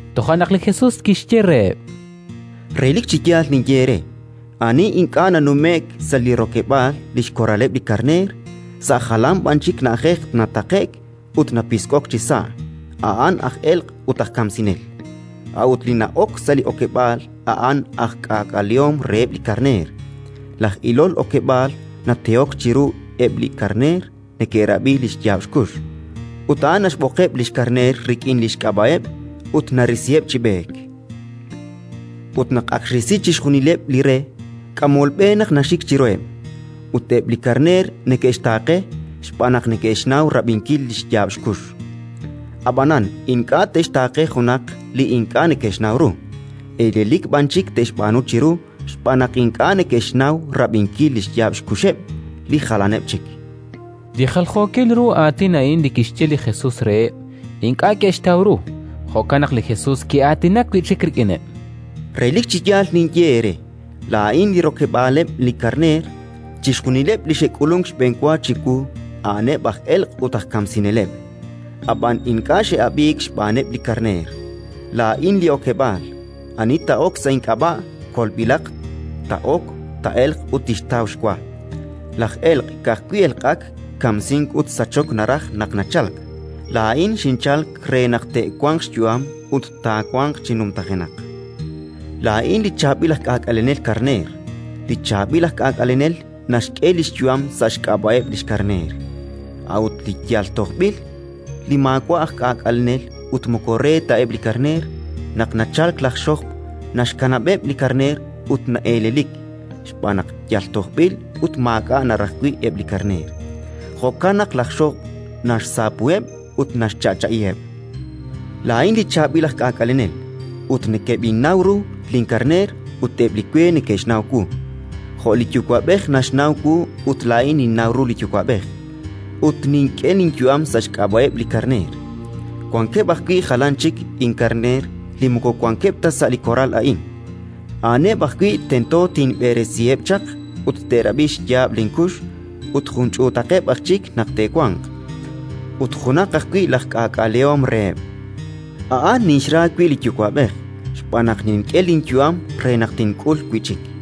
Toja' naq li Jesus kixye reheb': —Relik chi yaal ninye eere: ani ink'a' nanume'k sa' li rokeb'aal li xkoraleb' li karneer, sa' jalan b'an chik na'ajej nataqe'k ut napisk'ok chisa', a'an aj elq' ut aj kamsinel. A'ut li na'ok sa' li okeb'aal a'an aj k'aak'alehom reheb' li karneer. Laj ilol okeb'aal natehok chiru ut eb' li karneer neke'rab'i li xyaab' xkux; ut a'an naxb'oqeb' li xkarneer rik'in li xk'ab'a'eb' ut narisiheb' chi b'eek. Ut naq ak xrisi chixjunileb' li re, k'amol b'e naq naxik chiruheb', ut eb' li karneer neke'xtaaqe, xb'aan naq neke'xnaw rab'inkil li xyaab' xkux. Ab'anan ink'a' te'xtaaqe junaq li ink'a' neke'xnaw ru, elelik b'an chik te'xb'aanu chiru xb'aan naq ink'a' neke'xnaw rab'inkil li xyaab' xkuxeb' li jalaneb' chik. Li jaljookil ru aatin a'in li kixye li Jesus reheb', ink'a' ke'xtaw ru. Jo'kan naq li Jesus ki'aatinak wi' chik rik'ineb': —Relik chi yaal ninye eere: laa'in li rokeb'aaleb' li karneer. Chixjunileb' li xe'k'ulunk xb'enwa chiwu a'aneb' aj elq' ut aj kamsineleb'; ab'an ink'a' xe'ab'iik xb'aaneb' li karneer. Laa'in li okeb'aal. Ani taa'ok sa' ink'ab'a', kolb'ilaq; taa'ok, taa'elq ut tixtaw xwa. “Laj elq' ka'ajwi' elq'ak, kamsink ut sachok naraj naq nachalk. Laa'in xinchalk re naq te'wanq xyu'am ut taawanq chi numtajenaq. Laa'in li chaab'il aj k'aak'alenel karneer. Li chaab'il aj k'aak'alenel naxk'e li xyu'am sa' xk'ab'a'eb' li xkarneer. A'ut li yal tojb'il, li maawa' aj k'aak'alenel ut moko re ta eb' li karneer, naq nachalk laj xojb', naxkanab'eb' li karneer ut na'elelik, xb'aan naq yal tojb'il ut maak'a' naraj wi' eb' li karneer; jo'kan naq laj xojb' naxsaapuheb' ut naxcha'cha'iheb'. “Laa'in li chaab'il aj k'aak'alenel, ut nekeb'innaw ru linkarneer ut eb' li we neke'xnaw wu, jo' li Yuwa'b'ej naxnaw wu ut laa'in ninnaw ru li Yuwa'b'ej; ut nink'e linyu'am sa' xk'ab'a'eb' li karneer. Wankeb' ajwi' jalan chik inkarneer li moko wankeb' ta sa' li koral a'in; a'aneb' ajwi' tento tinb'eresiheb' chaq, ut te'rab'i xyaab' linkux, ut jun ch'uutaqeb' aj chik naq te'wanq, ut junaq ajwi' laj k'aak'alehom reheb'. “A'an ninxra wi' li Yuwa'b'ej, xb'aan naq nink'e linyu'am re naq tink'ul wi' chik.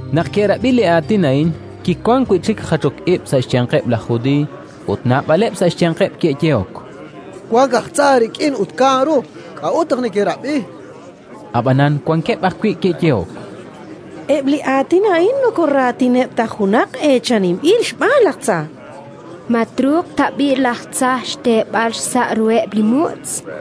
Naq ke'rab'i li aatin a'in, kiwank wi' chik jachok ib' sa' xyanqeb' laj Judiiy. Ut naab'aleb' sa' xyanqeb' ke'yehok: —Wank aj tza rik'in ut kaan ru. K'a'ut naq nekerab'i? Ab'anan wankeb' ajwi' ke'yehok: —Eb' li aatin a'in moko raatineb' ta junaq eechaninb'il xb'aan laj tza. Ma truuq tab'i' laj tza xteeb'al xsa' ruheb' li mutz'?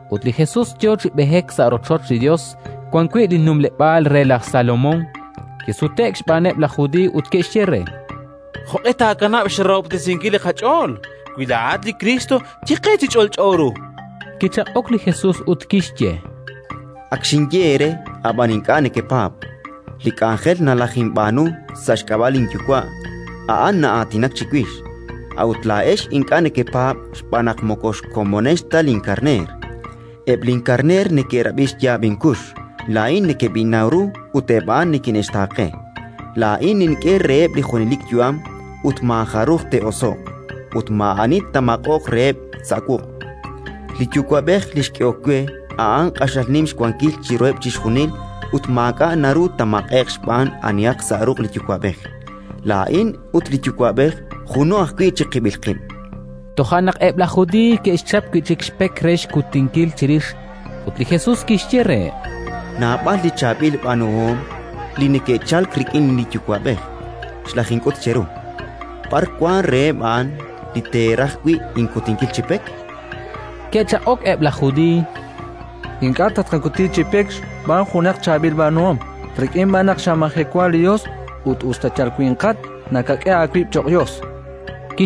ut li Jesus yo chi b'eek sa' rochoch li Yos wan wi' li numleb'aal re laj Salomón. Kisute'k xb'aaneb' laj Judiiy ut ke'xye re: —Jo'q'e taakanab' xrahob'tesinkil li qach'ool? Wi laa'at li Kriist, ye qe chi ch'olch'o ru. Kichaq'ok li Jesus ut kixye: —Ak xinye eere, ab'an ink'a' nekepaab'. Li k'anjel nalajinb'aanu sa' xk'ab'a' linYuwa', a'an na'aatinak chiwix; a'ut laa'ex ink'a' nekepaab' xb'aan naq moko xkomonex ta linkarneer. Eb' linkarneer neke'rab'i xyaab' inkux; laa'in nekeb'innaw ru ut eb' a'an nikine'xtaaqe. Laa'in nink'e reheb' li junelik yu'am ut maajaruj te'oso'q, ut maa'ani taamaq'oq reheb' sa' wuq'. Li Yuwa'b'ej li xk'ehokeb' we, a'an q'axal nim xwankil chiruheb' chixjunil ut maak'a' naru taamaq'e'q xb'aan anihaq sa' ruq' li Yuwa'b'ej. Laa'in ut li Yuwa'b'ej juno ajwi' chiqib'il qib'. Toja' naq eb' laj Judiiy ke'xchap wi' chik xpek re xkutinkil chirix. Ut li Jesus kixye reheb': —Naab'al li chaab'il b'aanuhom li neke'chalk rik'in li Yuwa'b'ej xlajink'ut cheru. B'ar wank reheb' a'an li teeraj wi' inkutinkil chi pek? Ke'chaq'ok eb' laj Judiiy: —Ink'a' tatqakuti chi pek xb'aan junaq chaab'il b'aanuhom, rik'in b'an naq xamajewa li Yos ut, us ta yal winqat, nakak'e aawib' cho'q Yos, chankeb' re.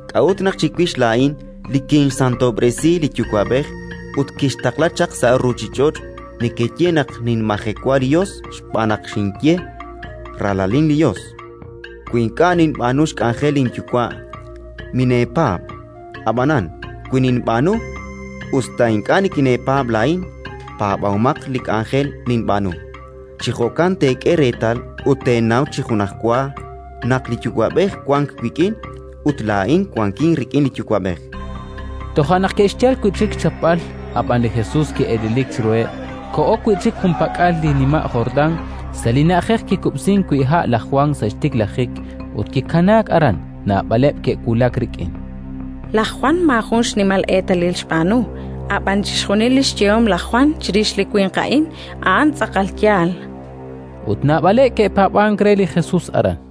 k'a'ut naq chiwix laa'in li kinxsantob'resi li Yuwa'b'ej ut kinxtaqla chaq sa' ruuchich'och' nekeye naq ninmajewa li Yos xb'aan naq xinye: «Ralalin li Yos»? Wi ink'a' ninb'aanu xk'anjel linYuwa', mineepaab'. Ab'anan, wi ninb'aanu, us ta ink'a' nikineepaab' laa'in, paab'omaq li k'anjel ninb'aanu. Chi jo'kan teek'e reetal ut teenaw chi junajwa naq li Yuwa'b'ej wank wik'in ut laa'in wankin rik'in li Yuwa'b'ej. Toja' naq ke'xyal wi' chik xchapb'al, ab'an li Jesus ki'elelik chiruheb'. Koho wi' chik junpak'al li nima' Jordán, sa' li na'ajej kikub'sink wi' ha' laj Jwan sa' xtiklajik, ut kikanaak aran. Naab'aleb' ke'wulak rik'in: “Laj Jwan maajun xnimal eetalil xb'aanu, ab'an chixjunil li xyehom laj Jwan chirix li winq a'in, a'an tz'aqal yaal”, chankeb'. Ut naab'aleb' ke'paab'ank re li Jesuus aran.